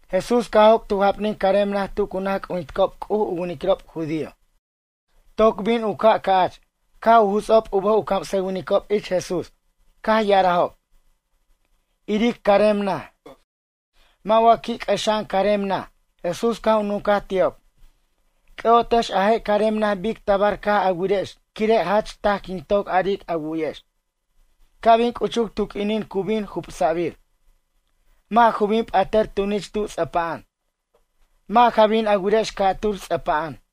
Jesús caj joc' tu japnin carem naj tu cu naj c'ujinticob C'uj u winiquirob judío. Toc bin u ca' ca'ch caj u juts'ob u bʌj u camsʌwinicob ich Jesús. Caj ya'arajob: ―Iric carem naj. Mʌ' wa qui' c'ʌxa'an carem naj? Jesús caj u nuncaj ti'ob: ―C'ʌ'otex a je' carem naj bic tabar caj a wirex quire' jach taj quin toc aric a wu'yex. Ca' bin c'uchuc tu q'uinin cu bin jubsa'bir. Mʌ' ju bin p'atʌr tunich tu ts'ʌpa'an. Mʌ' ja bin a wirex ca'tur ts'ʌpa'an.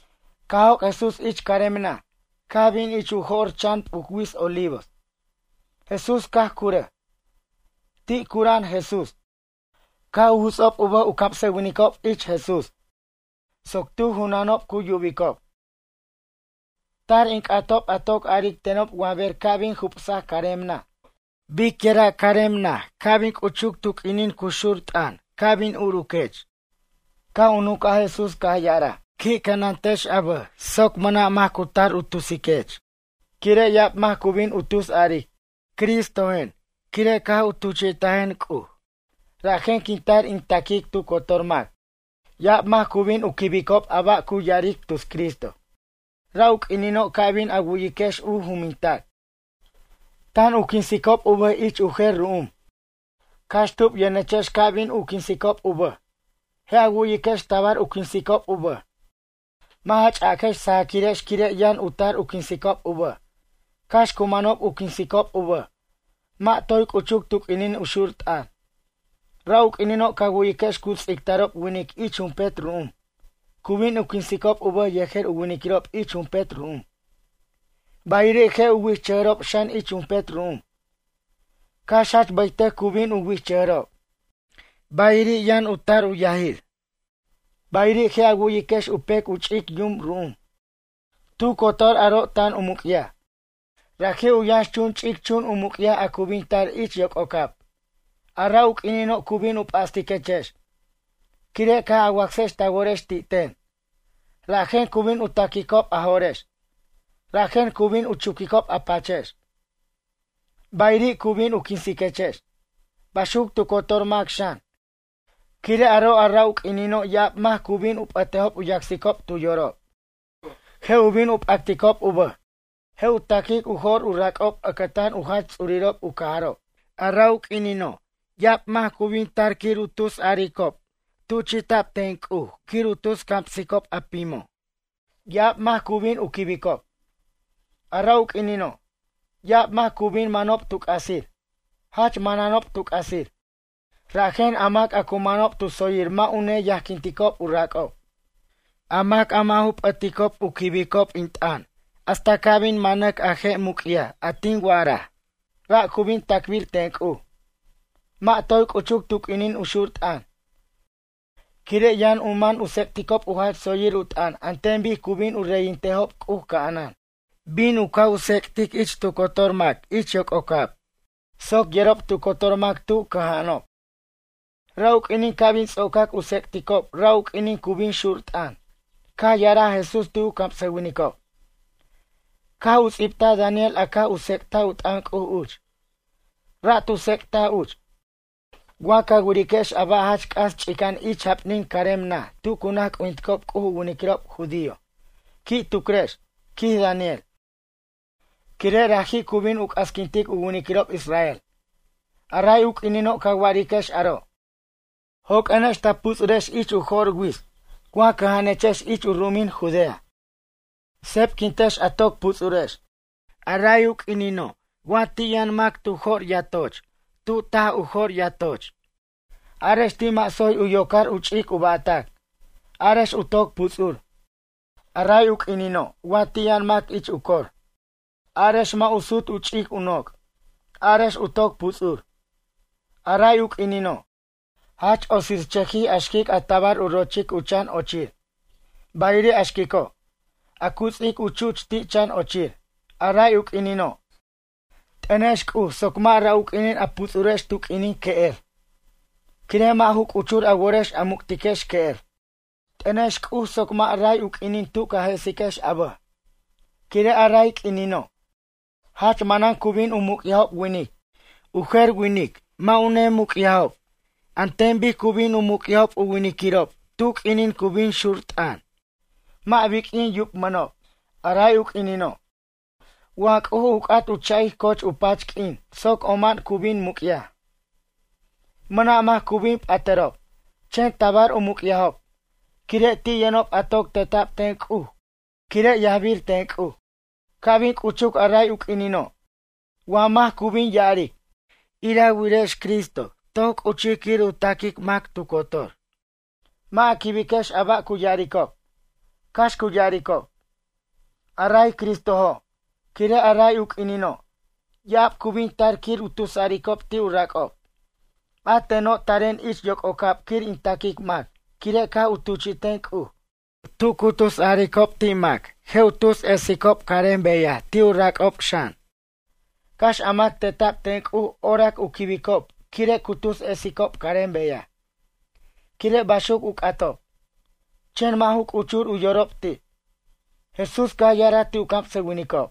Caj joc' Jesús ich carem naj, caj bin ich u jo'r chan p'uc wits Olivos. Jesús caj curʌj. Ti' cura'an Jesús, caj u juts'ob u bʌj u camsʌwinicob ich Jesús soc tu junanob cu yubicob. ―Tar in c'atob a toc aric tenob wa ber ca' bin jubsac carem naj. Biquira' carem naj ca' bin c'uchuc tu q'uinin cu xur t'ʌn ca' bin urquech? Caj u nuncaj Jesús caj ya'araj: ―Qui' cʌnantex a bʌj soc mʌna' mac cu tar u tusiquex. Quire' ya'ab mac cu bin u tus aric: “Cristojen quire' caj u tuchi'tajen C'uj. Rajen quin tar quir in taquic tu cotor mac.” Ya'ab mac cu bin u quibicob a ba' cu ya'aric tus Cristo. Ra' u q'uinino' ca' bin a wu'yiquex u jumintac: “Tan u quinsicob u bʌj ich u jer ru'um.” Cax tub yʌnechex ca' bin u quinsicob u bʌj. Je' a wu'yiquex tabar u quinsicob u bʌj. Mʌ' ja ch'aquex sajaquirex quire' yʌn u tar u quinsicob u bʌj. Cax cu manob u quinsicob u bʌj. Mʌ' toy c'uchuc tu q'uinin u xur t'ʌn. Ra' u q'uinino' ca wu'yiquex cu ts'ictarob winic ich jumpet ru'um. Cu bin u quinsicob u bʌj yejer u winiquirob ich jumpet ru'um. Bayiri' je' u wichʌjʌrob xan ich jumpet ru'um. Cax jach bʌytʌc cu bin u wichʌjʌjrob. Bayiri' yʌn u tar u yajir. Bayiri' je' a wu'yiquex u pec u ch'ic yum ru'um. Tu cotor aro' tan u muc'yaj. Raji' u yʌnx ch'ic chun u muc'yaj a cu bin tar ich yoc'ocab. ’A ra' u q'uinino' cu bin u p'astiquechex, quire' caj a wacsex ta worex ti' ten. Rajen cu bin u ta'quicob a jo'rex. Rajen cu bin u chuquicob a pachex. Bayiri' cu bin u quinsiquechex. Baxuc tu cotor mac xan. Quire' aro', a ra' u q'uinino' ya'ab mac cu bin u p'ʌtejob u yacsicob tu yorob. Je' u bin u p'acticob u bʌj. Je' u ta'quic u jo'r u rac'ob ʌcʌtan u jach ts'urirob u cajarob. A ra' u q'uinino', ya'ab mac cu bin tar quir u tusaricob tuchi'tac ten C'uj quir u tus camsicob a pimo'. Ya'ab mac cu bin u quibicob. A ra' u q'uinino', ya'ab mac cu bin manob tu c'asir. Jach mananob tu c'asir. Rajen a mac a cu manob tu tsoyir mʌ' u neyajquinticob u rac'ob. A mac a mʌ' ju p'ʌticob u quibicob in t'ʌn hasta ca' bin manac a je' muc'yaj a tin wa'araj. Ra' cu bin tacbir ten C'uj. Mʌ' toy c'uchuc tu q'uinin u xur t'ʌn, quire' yʌn u man u tsec'ticob u jach tsoyir u t'ʌn an ten bic cu bin u reyintejob C'uj ca'anan. Bin u caj tsec'tic ich tu cotor mac ich yoc'ocab soc yerob tu cotor mac tu cʌja'anob. Ra' u q'uinin ca' bin ts'ocac u tsec'ticob ra' u q'uinin cu bin xur t'ʌn. Caj ya'araj Jesús ti' u camsʌwinicob: ―Caj u ts'ibtaj Daniel a caj u tsec'taj u t'ʌn C'uj uch. Ra' tu tsec'taj uch: “Wa ca wiriquex a ba' jach c'as ch'ica'an ich u japnin carem naj tu cu naj c'ujinticob C'uj u winiquirob judío. Qui' tucrex, quij Daniel, quire' raji' cu bin u c'asquintic u winiquirob israel.” A ray u q'uinino' ca wiriquex aro', joq'uenex ta puts'urex ich u jo'r wits. Wa cʌja'anechex ich u ru'umin Judea, sebquintex a toc puts'urex. A ray u q'uinino' wa ti' yʌn mac tu jo'r yatoch tu taj u jo'r yatoch. Arex ti' mʌ' tsoy u yocar u ch'ic u ba'tac. Arex u toc puts'ur. A ray u q'uinino' wa ti' yʌn mac ich u cor. Arex mʌ' u sut u ch'ic u noc'. Arex u toc puts'ur. A ray u q'uinino', jach otsirchʌjij a xquic a tabar u rochic u chan ochir. Bayiri' a xquico', a cu ts'ic u chuch ti' chan ochir. A ray u q'uinino', t'ʌnex C'uj soc mʌ' ra' u q'uinin a puts'urex tu q'uinin que'er. Quire' mʌ' ju c'uchur a worex a muc'tiquex que'er. T'ʌnex C'uj soc mʌ' ray u q'uinin tu ca jesiquex a bʌj. Quire' a ray q'uinino', jach manan cu bin u muc'yajob winic. U jer winic mʌ' u nemuc'yajob an ten bic cu bin u muc'yajob u winiquirob tu q'uinin cu bin xur t'ʌn. Mʌ' biq'uin yubmʌnob. A ray u q'uinino', wa C'uj u c'at u cha'ic coch u pach q'uin soc oma'an cu bin muc'yaj. Mʌna' mac cu bin p'atʌrob. Chen tabar u muc'yajob, quire' ti' yʌnob a toc teta'b ten C'uj quire' yajbir ten C'uj. ’Ca' bin c'uchuc a ray u q'uinino' wa mac cu bin ya'aric: “Ire wirex Cristo toc c'uchij quir u taquic mac tu cotor.” Mʌ' a quibiquex a ba' cu ya'aricob. Cax cu ya'aricob: “A ray Cristojo'.” Quire' a ray u q'uinino', ya'ab cu bin tar quir u tusaricob ti' u rac'ob: “A teno' taren ich yoc'ocab quir in taquic mac quire' caj u tuchi'ten C'uj.” Tu cu tusaricob ti' mac je' u tus esicob carem beyaj ti' u rac'ob xan. Cax a mac teta'b ten C'uj orac u quibicob quire' cu tus esicob carem beyaj, quire' baxuc u c'atob, chen mʌ' ju c'uchur u yorob ti'. Jesús caj ya'araj ti' u camsʌwinicob: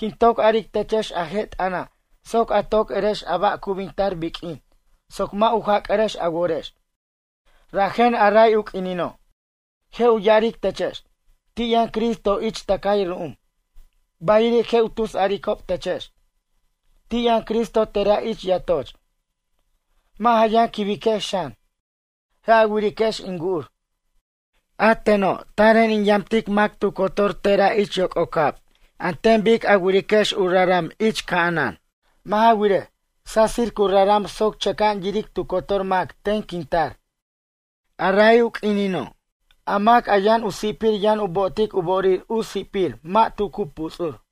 ―Quin toc aric techex a je' t'ʌna' soc a toc erex a ba' cu bin tar biq'uin soc mʌ' u jac'arex a worex. Rajen a ray u q'uinino' je' u ya'aric techex: “Ti' yʌn Cristo ich tʌcay ru'um.” Bayiri' je' u tusaricob techex: “Ti' yʌn Cristo tera' ich yatoch.” Mʌ' ja yʌn quibiquex xan. Je' a wiriquex in wu'ur, a teno' taren in yamtic mac tu cotor, tera' ich yoc'ocab an ten bic a wiriquex u raram ich ca'anan. Mʌ' ja wirej, sasir cu raram soc chʌca'an yiric tu cotor mac ten quin tar. Ray u q'uinino', a mac yʌn u si'pir yʌn u bo'otic u bo'orir u si'pir mʌ' tu cu puts'ur.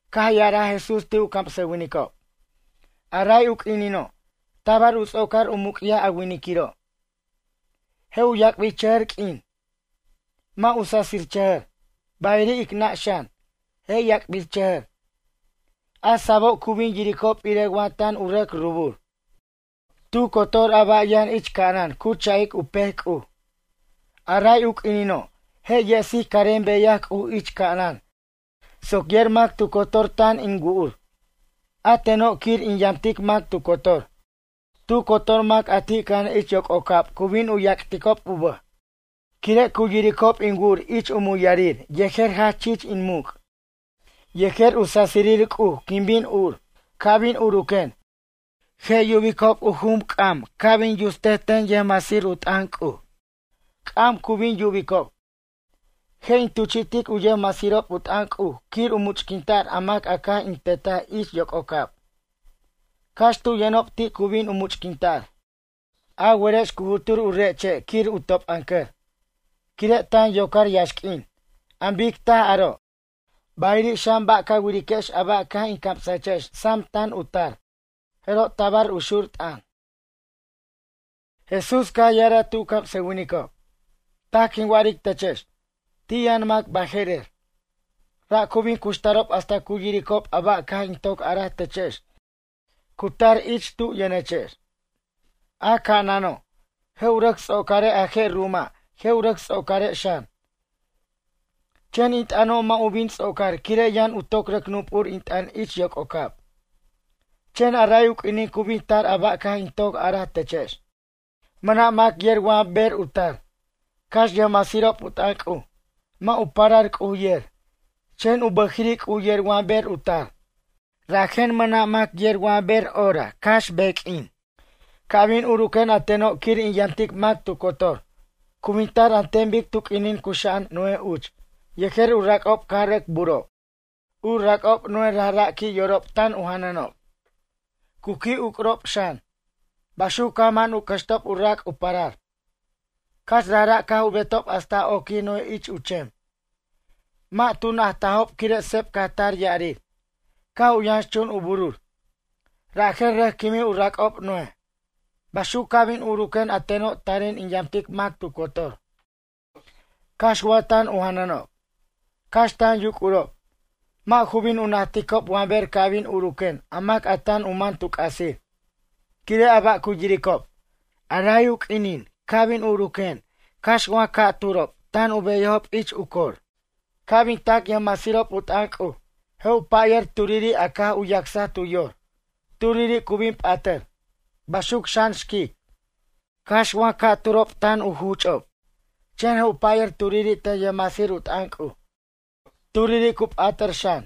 Caj ya'araj Jesús ti' u camsʌwinicob: ―A ray u q'uinino', tabar u ts'ocar u muc'yaj a winiquiro'. Je' yac'birchʌjʌr q'uin. Mʌ' u sasichʌjʌr. Bayiri' ic nʌ' xan, je' yac'birchʌjʌr. A sa'abo' cu bin yiricob irej wa tan u rʌc rubur. Tu cotor a ba' yʌn ich ca'anan cu cha'ic u pec C'uj. A ray u q'uinino', je' yesic carem beyaj C'uj ich ca'anan soc yer mac tu cotor tan in wu'ur, a teno' quir in yamtic mac tu cotor. Tu cotor mac a ti' cʌja'an ich yoc'ocab cu bin u yac'ticob u bʌj, quire' cu yiricob in wu'ur ich u muyar yejer jach chich in muc'. Yejer u sasirir C'uj quin bin ur. Ca' bin uruquen, je' yubicob u jum ca' bin usac ten yʌjmasir u t'ʌn C'uj. C'am cu bin yubicob. Je' in tuchi'tic u yʌjmasirob u t'ʌn C'uj quir u much'quinta'r a mac caj in tetaj ich yoc'ocab. Cax tu yʌnob ti' cu bin u much'quinta'r. ’A werex cu jutur u re' che' quir u top'ʌncʌr, quire' tan yocar yaxq'uin. An bic taj aro', bayiri' xan ba' ca wiriquex a ba' caj in camsajechex sam tan u tar. Jeroj tabar u xur t'ʌn. Jesús caj ya'araj ti' u camsʌwinicob: ―Taj quin wa'aric techex. Ti' yʌn mac baje'rer. Ra' cu bin cuxtarob hasta cu yiricob a ba' caj in toc araj techex cu tar ich tu yʌnechex. A ca'anano', je' u rʌc ts'ocare' a je' ru'uma' je' u rʌc ts'ocare' xan. Chen in t'ʌno' mʌ' u bin ts'ocar quire' yʌn u toc rʌc nup'ur in t'ʌn ich yoc'ocab. ’Chen a ray u q'uinin cu bin tar a ba' caj in toc araj techex. Mʌna' mac yer wa ber u tar, cax yʌjmasirob u t'ʌn C'uj. Mʌ' u parar C'uj yer, chen u bʌjiri' C'uj yer wa ber u tar. Rajen mʌna' mac yer wa ber hora cax beq'uin. ’Ca' bin uruquen a teno' quir in yamtic mac tu cotor. Cu bin tar an ten bic tu q'uinin cuxa'an Noé uch yejer u rac'ob caj rʌc burob. U rac'ob Noé rajra' qui' yorob tan u janʌnob, cu qui' uc'urob xan. Baxuc caj man u cʌxtob u rac' u parar. Cax rajra' caj u betob hasta oquij Noé ich u chem. Mʌ' tu najtajob quire' seb caj tar ya'arir. Caj u yʌnxchun u burur. Rajen rʌc quimij u rac'ob Noé. Baxuc ca' bin uruquen a teno' taren in yamtic mac tu cotor. Cax wa tan u janʌnob. Cax tan yuc'urob. Mʌ' ju bin u najticob wa ber ca' bin uruquen a mac tan u man tu c'asir, quire' a ba' cu yiricob. Ray u q'uinin ca' bin uruquen cax wa ca'turo' tan u beyajob ich u cor. Ca' bin tac yʌjmasirob u t'ʌn C'uj, je' u pʌyʌr turiri' a caj u yacsaj tu yor. Turiri' cu bin p'atʌr. Baxuc xan xquic. Cax wa ca'turo' tan u juch'ob. Chen je' u payʌr turiri' ten yʌjmasirob u t'ʌn C'uj. Turiri' cu p'atʌr xan.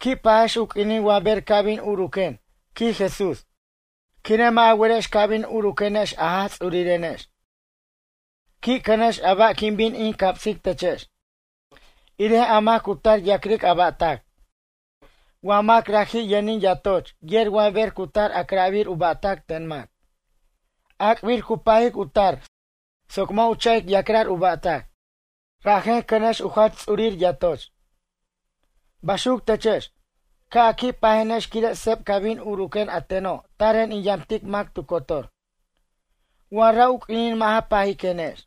’Qui' pajex u q'uinin wa ber ca' bin uruquen ―quij Jesús―. Quire' mʌ' a werex ca' bin uruquenex a Jaj Ts'urirenex. Qui' cʌnex a ba' quin bin in camsic techex. Irej a mac cu tar ya'cric a ba'tac. Wa mac raji' yʌnin yatoch yer wa ber cu tar a'cra'bir u ba'tac ten mac. Ac'bir cu pajic u tar soc mʌ' u cha'ic ya'cra'r u ba'tac. Rajen cʌnex u jach ts'urir yatoch. Baxuc techex, ca' a qui' pajenex quire' seb ca' bin uruquen a teno' taren in yamtic mac tu cotor. Wa ra' u q'uinin mʌ' ja pajiquenex.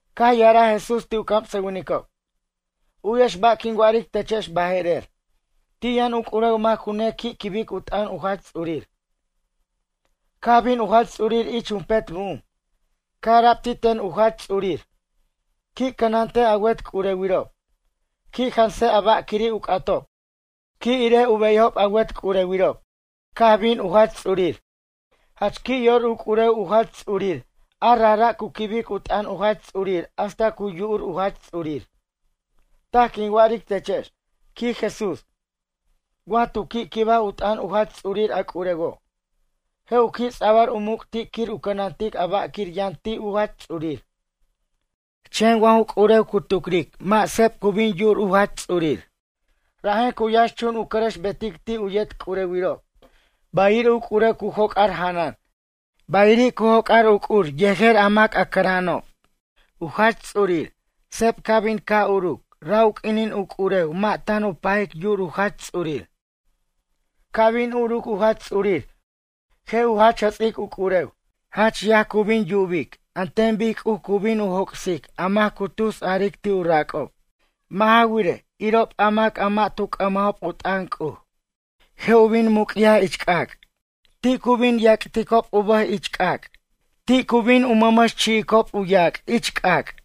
Caj ya'araj Jesús ti' u camsʌwinicob: ―U'yex ba' quin wa'aric techex baje'rer. Ti' yʌn u c'urew mac cu nequi' quibic u t'ʌn u jach ts'urir. Caj bin u jach ts'urir ich jumpet ru'um. Caj ara'b ti' ten u jach ts'urir: “Qui' cʌnantej a wet c'urewirob. Qui' jansej a ba' quiri' u c'atob. Qui' irej u beyajob a wet c'urewirob.” Caj bin u jach ts'urir. Jach qui' yor u c'urew u jach ts'urir a rajra' cu quibic u t'ʌn u jach ts'urir hasta cu yu'ur u jach ts'urir. Taj quin wa'aric techex ―quij Jesús―. Wa tu qui' quibaj u t'ʌn u jach ts'urir a c'urewo'. Je' u qui' ts'abʌr u muc' ti' quir u cʌnantic a ba'quir yʌn ti' u jach ts'urir. Chen wa ju c'urew cu tucric mʌ' seb cu bin yu'ur u jach ts'urir. Rajen cu yʌnxchun u cʌrʌxbetic ti' u yet c'urewirob. Bayiri' u c'urew cu joc'ar janʌn. Bayiri' cu joc'ar yuc'ur yet a mac cʌra'anob. U jach ts'urir seb ca' bin ca' uruc ra' u q'uinin u c'urew mʌ' tan u pajic yu'ur u jach ts'urir. Ca' bin uruc u jach ts'urir je' u jach jʌts'ic u c'urew. Jach yaj cu bin yubic an ten bic C'uj cu bin joc'sic a mac cu tusaric ti' u rac'ob. Mʌ' ja wirej, irob a mac a mʌ' tu c'ʌmajob u t'ʌn C'uj. Je' u bin muc'yaj ich c'ac'. Ti' cu bin yac'ticob u bʌj ich c'ac'. Tu cu bin mʌmʌx chi'icob u yac' ich c'ac'.